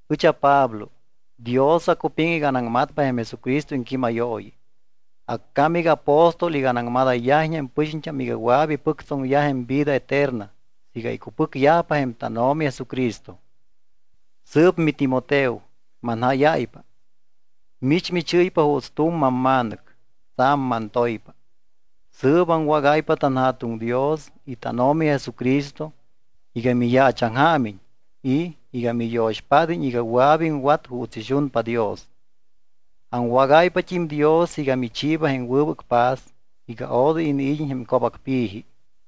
Ɨch aPablo. Dios acupiŋ iga anaŋmatpa jém Jesucristo iŋquímayooyi. Accám iga aapóstol iga anaŋmadayyajiñ jém pɨxiñt́am iga wɨa̱p ipɨctsoŋyaj jém vida eterna siiga icupɨcyajpa jém tánO̱mi Jesucristo. Sɨɨp miTimoteo, manjáyáypa. Mich michɨ́ypa juuts tu̱m mamma̱nɨc. Tsa̱m mantoypa. Sɨɨp aŋwágáypa tanJa̱tuŋ Dios y tánO̱mi Jesucristo iga miyaachaŋjaamiñ y iga miyo̱xpád́iñ iga wɨa̱p iŋwat juuts ixunpa Dios. Aŋwágáypat́im Dios iga michiiba jém wɨbɨc paz iga odoy iniid́iñ jém co̱bacpi̱ji.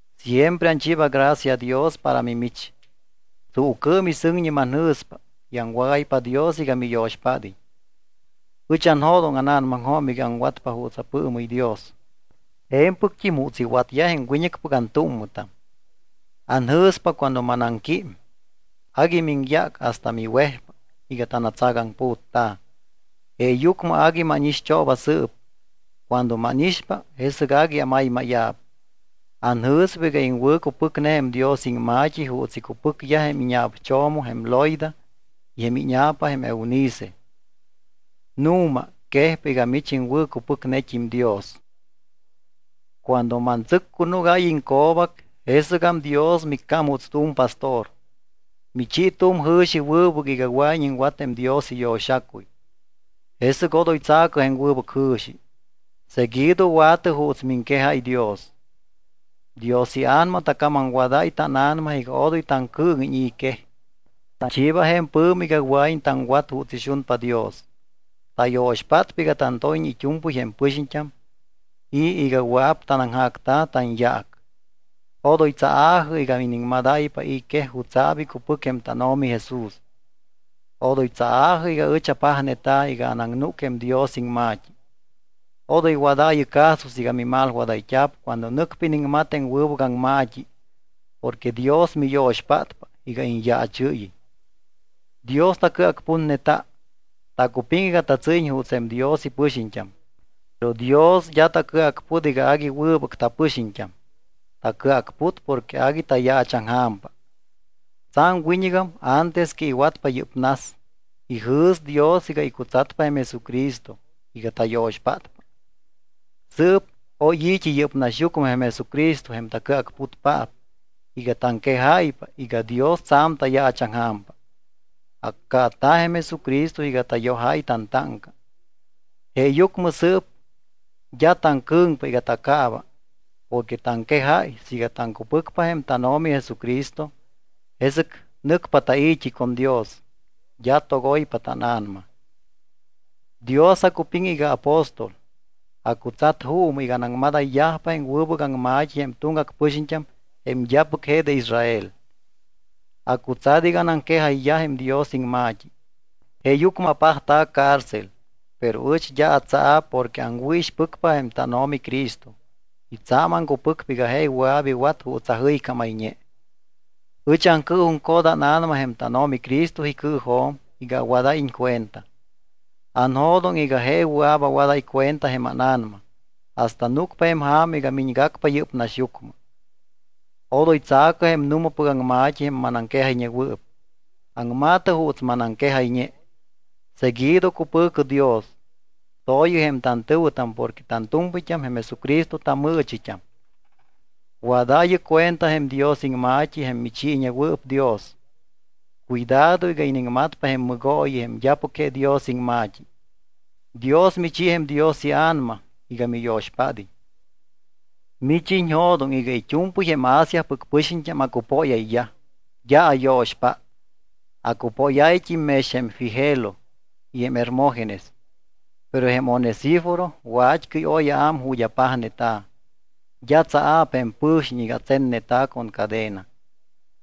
Siempre anchiiba gracia Dios para mimich. Tsuucɨɨm y sɨŋñi manjɨ̱spa y aŋwágáypa Dios iga miyo̱xpád́iñ. Ɨch anjo̱doŋ ána̱namaŋjo̱m iga aŋwatpa juuts apɨɨmɨ́y Dios je̱mpɨct́im juuts iwatyaj jém wiñɨcpɨc antúmmɨtam. Anjɨ̱spa cuando mamanaŋquím, agui miŋyác hasta miwejpa iga tanatsacaŋputta̱. Jeeyucmɨ agui mánixt́ooba sɨɨp. Cuando mánixpa, jesɨc agui amaymáya̱p. Anjɨ̱spa iga iŋwɨ̱cupɨcne jém Dios iŋma̱t́i juuts icupɨcyaj jém íña̱pcho̱mo jém Loida y jém íña̱pa jém Eunice. Nu̱ma, quejpa iga mich iŋwɨ̱cupɨcnet́im Dios. Cuando mantsɨccunúgáy iŋco̱bac, jesɨgam Dios miccám juuts tu̱m pastor. Michi tu̱m jɨ̱xi wɨbɨc iga wɨa̱iñ iŋwat jém Dios iyo̱xacuy. Jesɨc odoy tsa̱cɨ jém wɨbɨc jɨ̱xi, seguido wa̱tɨ juuts miŋquejáy Dios. Dios iA̱nama tacamamwadáy tána̱nama iga odoy taŋcɨɨŋiñ i̱ quej. Tachiiba jém pɨ̱mi iga wɨa̱iñ taŋwat juuts ixunpa Dios. Tayo̱xpátpa iga tantóyiñ it́u̱mpɨy jém pɨxiñt́am y iga wɨa̱p tanaŋjacta̱ tanyaac. Odoy tsaa̱jɨ iga iniŋmadáypa i̱ quej jutsa̱p icupɨc jém tánO̱mi Jesús. Odoy tsaa̱jɨ iga ɨch apajneta̱ iga anaŋnúc jém Dios iŋma̱t́i. Odoy wadaayɨ caso siiga mimalwadayt́a̱p cuando nɨcpa iniŋmat jém wɨbɨc aŋma̱t́i porque Dios miyo̱xpátpa iga iñyaachɨ́yiñ. Dios tacɨacputneta. Tacupiŋ iga tatsɨ́yiñ juuts jém Dios ipɨxiñt́am. Pero Dios d́a tacɨacput iga agui wɨbɨc tapɨxiñt́am, tacɨacput porque agui tayaachaŋja̱mpa. Tsa̱m wiñɨgam antes que iwatpa yɨ́p nas, ijɨ̱s Dios iga icutsatpa jém Jesucristo iga tayo̱xpátpa. Sɨɨp oy yɨ́p naxyucmɨ jém Jesucristo jém tacɨacputpaap iga taŋquejáypa iga Dios tsa̱m tayaachaŋja̱mpa. Accaata̱ jém Jesucristo iga tayojáy tantáŋca, jeeyucmɨ sɨɨp d́a taŋcɨ̱ŋpa iga tacaaba porque taŋquejáy siiga taŋcupɨcpa jém tánO̱mi Jesucristo, jesɨc nɨcpa tai̱t́i con Dios, d́a togoypa tána̱nama. Dios acupiŋ iga aapóstol, acutsat juumɨ iga anaŋmadayyajpa jém wɨbɨc aŋma̱t́i jém tuŋgac pɨxiñt́am jém d́apɨc je de Israel. Acutsat iga anaŋquejayyaj jém Dios iŋma̱t́i. Jeeyucmɨ apajta̱ cárcel, pero ɨch d́a atsaa̱p porque aŋwɨ̱ixpɨcpa jém tánO̱mi Cristo y tsa̱m aŋcupɨcpa iga je wɨa̱p iwat juuts ajɨycámayñe. Ɨch aŋcɨɨjuŋcot ána̱nama jém tánO̱mi Cristo icɨɨjo̱m iga awadáyiñ cuenta. Anjo̱doŋ iga je wɨa̱p awadáy cuenta jém ána̱nama hasta núcpa jém ja̱ma iga miñgacpa yɨ́p naxyucmɨ. Odoy tsa̱cɨ jém nu̱mapɨc aŋma̱t́i jém manaŋquejayñewɨɨp. Aŋma̱tɨ juuts manaŋquejayñe. Seguido cupɨ̱cɨ Dios. To̱yɨ jém tantɨ̱wɨtam porque tantu̱mpɨyt́am jém Jesucristo tamɨɨchit́am. Wadaayɨ cuenta jém Dios iŋma̱t́i jém michiiñewɨɨp Dios. Cuidado iga iniŋmatpa jém mɨgooyi jém d́apɨc je Dios iŋma̱t́i. Dios michi jém Dios iA̱nama iga miyo̱xpád́iñ. Mich iñjo̱doŋ iga it́u̱mpɨy jém Asiapɨc pɨxiñt́am acupóyayyaj, d́a ayo̱xpát. Acupóyáyt́im mex jém Figelo y Hermógenes. Pero jém Onesíforo wat́cɨy oy aám ju̱t́ apajneta̱. D́a tsaa̱p jém pɨ̱xiñ iga atsenneta̱ con cadena.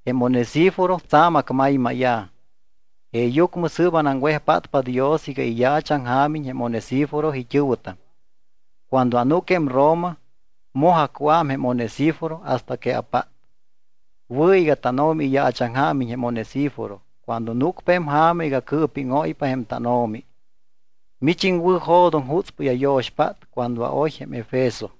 Jém Onesíforo tsa̱m acmaymáya̱. Jeeyucmɨ sɨɨp anaŋwejpátpa Dios iga iyaachaŋjaamiñ jém Onesíforo it́ɨ̱wɨtam. Cuando anúc jém Roma, moj acuám jém Onesíforo hasta que apát. Wɨ̱ iga tánO̱mi iyaachaŋjaamiñ jém Onesíforo cuando núcpa jém ja̱ma iga cɨɨpíŋóypa jém tánO̱mi. Mich iŋwɨ̱jo̱doŋ jutspɨy ayo̱xpát cuando aoy jém Efeso.